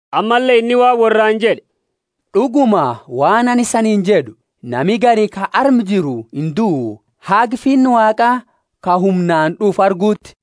Ammalle inni waan worraani jed'e, D'uguma, waan anini isaniini jed'u, Nami gari ka arma jiru induu, haga Finna Waaqa ka humnaani d'ufu arguuti.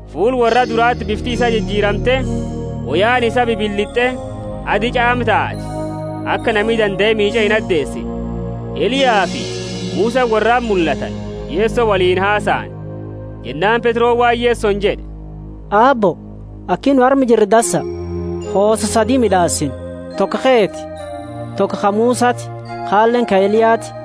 Fuula worra durati bifti isaa jijiramte, woyaani isaa bibilit'e, adi ch'aama taate, aka nami dandae miich'e inadeesine. Eliyafi Musani worrati mullatani, Yeso woliini hasaani. Jennaani Petroni waan Yesoni jed'e, Aabbo, aki nu arma jiru dansa, hoosa sadi mid'aasina, toko keeti, toko ka Musati, kaleeni ka Eliyati.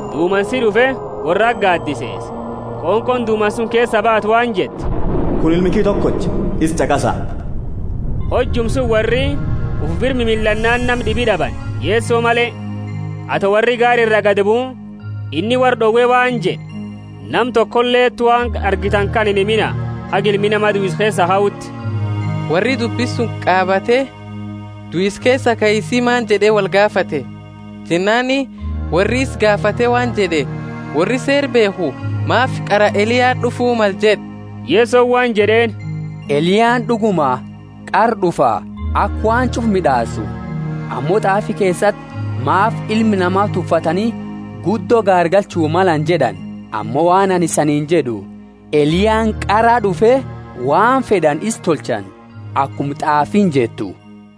Dumansi d'ufe, worrati gaadiseese, qonqooni dumansa suni keesaa baate waan jette, Kunini Ilma kiyya tokocha, isa ch'aqasa. Hojuma suni worri ufi bira mimillannaani nama d'ibi d'abani, Yeso male. Ato worri gaara iraa gadibuu, inni worra d'owe waan jed'e, Nama tokoleti waan argitani kana inhimina, haga Ilmi Nama duisa keesaa kauti. Worri dubbi suni qaabate, duisa keesa kaisi maani? jed'e wolgaafate. Jennaani worri isa gaafate waan jed'e, Worri Seera beekhu maafi qara Eliyaani d'ufu male jed'a? Yesoni waan jed'eeni, Eliyaani d'uguma qara d'ufa aka waan ch'ufa mid'aasu. Ammo t'aafi keesati maafi Ilma Nama tuffatani guddo gaargalchu malani jed'ani? Ammo waan anini isaniini jed'u, Eliyaani qaraa d'ufe, waan fed'ani isa tolchani, akuma t'aafiini jettu.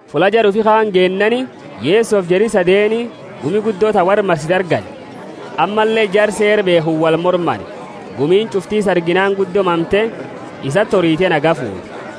Fulla jara ufi kaani geennaani, Yesofi jari sadeenu gumi guddo ta worra marsitu argani, ammalle jara Seera beekhu wolmormani. Gumiini ch'ufti isa arginaani guddo mamte, isati orite nagaya fuute.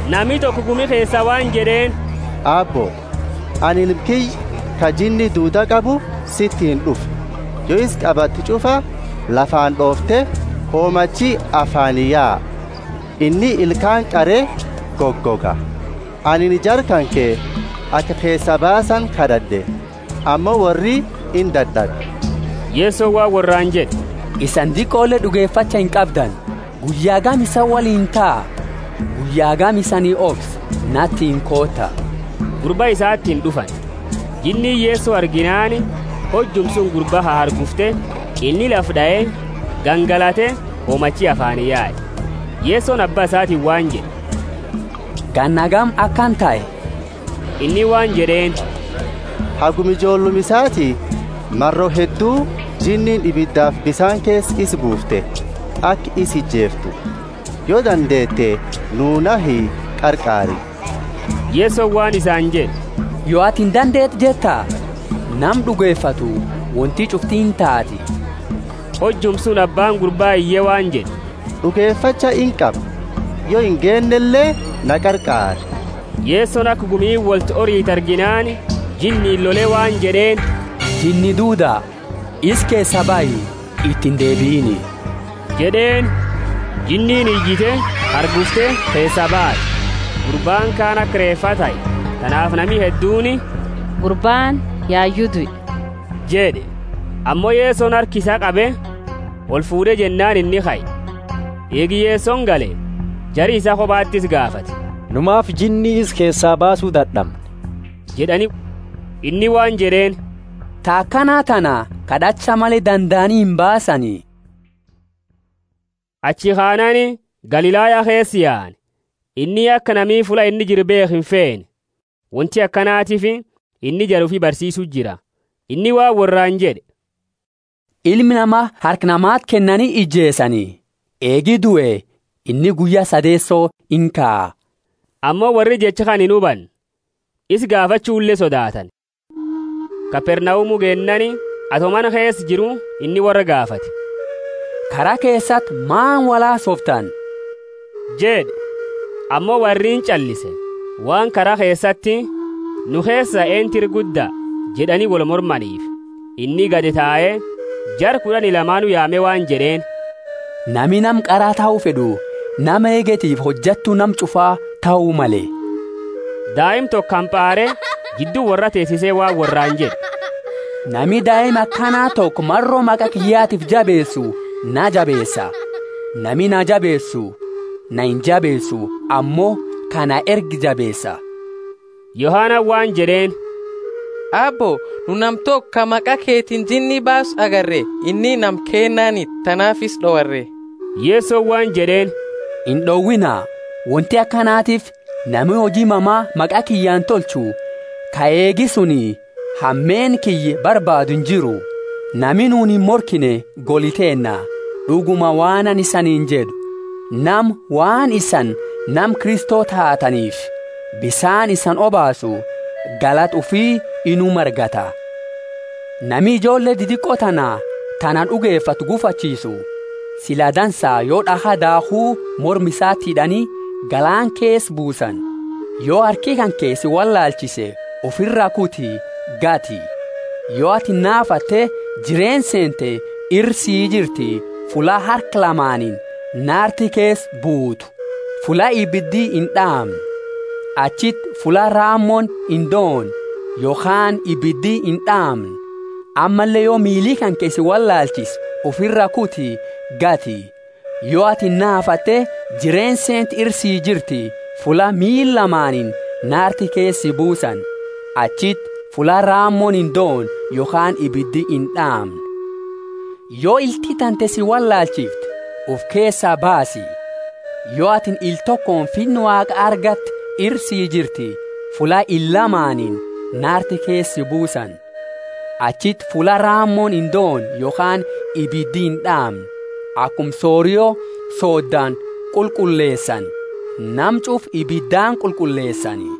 Nami toko gumi keesaa waan jed'eeni, Aabbo, anini ilma kiyya, ka jinni duuda qabu, sitiini d'ufe. Yo isa qabattu ch'ufa lafaani d'oofte, homachi afaani yae, inni ilkaani qare gogoga. Anini jara kanke aka keesaa baasani kad'ad'e, ammo worri indad'abe. Yesoni waan worraani jed'e, Isani diqole d'ugefacha inqabdani; guyya hagami isani woliini taa? Guyya hagami isani obsa? Natiini koota. Gurba isatiini d'ufani. Jinniini Yeso arginaani hojuma suni gurba hahargufte, inni lafa d'ae, gangalate, hoomachi afaani yae. Yesoni abba isatiini waan jed'e, Ganna hagami akana tahe? Inni waan jed'eeni, Haguma ijoolluma isaati. Maro heddu jinniini ibidafi bisaani keesa isa buufte, aka isa ijeeftu. Yo dandeete, nuu nahi, qarqaari. Yesoni waan isani jed'e, Yo atini dandeete jetta? Nama d'ugefatu wonti ch'ufti intaati. Hojuma suni abbaani gurbaa iye waan jed'e, D'ugefacha inqaba, yo ingeennele, na qarqaari. Yesoni aka gumiini wolti oritu arginaani, jinniini lole waan jed'eeni, Jinni duuda, isa keesaa bahi, iti indeebiini jed'eeni. Jinniini iyite, hargufte, keesaa baate. Gurbaani kaani aka reefaa tahe, tanaafi nami hedduuni, Gurbaani yayu due jed'e. Ammo Yesoni harka isaa qabe, olfuud'e jennaani inni kae. Eegi Yesoni gale, jari isaa kobati isa gaafate, Nu maafi jinni isa keesaa baasu dad'amne? jed'ani. Inni waan jed'eeni, Ta akana tana kad'acha male dandaani imbaasani. Achi kanaani Galilaya keesaa yaani. Inni aka nami fulla inni jiru beekhu infeene. Wonti akanatiifi inni jara ufi barsiisu jira. Inni waan worraani jed'e, Ilma Nama harka namati kennani ijeesani. Eegi due inni guyya sadeeso inkaa. Ammo worri jecha kana inhubanne, isa gaafachule sodaatani. Kapernaumu geennaani, ato mana keesa jiru, inni worra gaafate, Kara keesati maani wolhasooftani? jed'e. Ammo worri inch'allise, waan kara keesati, Nu keesa, eentu ira gudda? jed'ani wolmormaniifi. Inni gadi tae, jara kud'ani lamaanu yaame waan jed'eeni, Nami nama qara tahu fed'u nama eegetifi hojattu nama ch'ufa tahu male. Daima toko hampaare jiddu worraa teesise waan worraani jed'e, Nami daima akana toko maro maqa kiyyatiifi jabeesu naa jabeesa; nami naa jabeesu naa injabeesu, ammo ka na erge jabeesa. Yohanani waan jed'eeni, Aabbo, nu nama toko ka maqa kanketiini jinni baasu agarre. Inni nama keennaaniti, tanaafi isa d'owarre. Yesoni waan jed'eeni, Ind'owiina, wonti akanatiifi nami huji mama maqa kiyyaani tolchu, ka eegi suni hameenna kiyya barbaadu injiru. Nami nuuni imorkine goli teenna. D'uguma waan anini isaniini jed'u, Nama, waan isani nama Kristo taataniifi, bisaani isani obaasu, galata ufi inuma argata. Nami ijoolle didiqo tana ta na d'ugefattu guufachiisu, sila dansa yo d'akha daakhu morma isati hid'ani, galaana keesa buusani. Yo harki kanke si wollaalchise ufira kuti, gati! Yo atini naafatte jireenna seente ira sii jirti, fulla harka lamaaniini naarti keesa buutu, fulla ibidi ind'aamne. [ Achiti fulla raamooni indoone yokhaani ibidi ind'aamne.] Ammalle yo miili kanke si wollaalchise ufira kuti, gati! Yo atini naafatte jireenna seente ira sii jirti, fulla miila lamaaniini naarti keesa si buusani. [ Achiti fulla raamooni indoone yokhaani ibidi ind'aamne.] Yo ilti tante si wollaalchifte, ufi keesaa baasi. Yo atini ila tokooni Finna Waaqa argatte ira si jirti, fulla ila lamaaniini naarti keesa si buusani. Achiti fulla raamooni indoone yokhaani ibidi ind'aamne. Akuma sorio sooddani qulqulleesani, nama ch'ufa ibidaani qulqulleesani.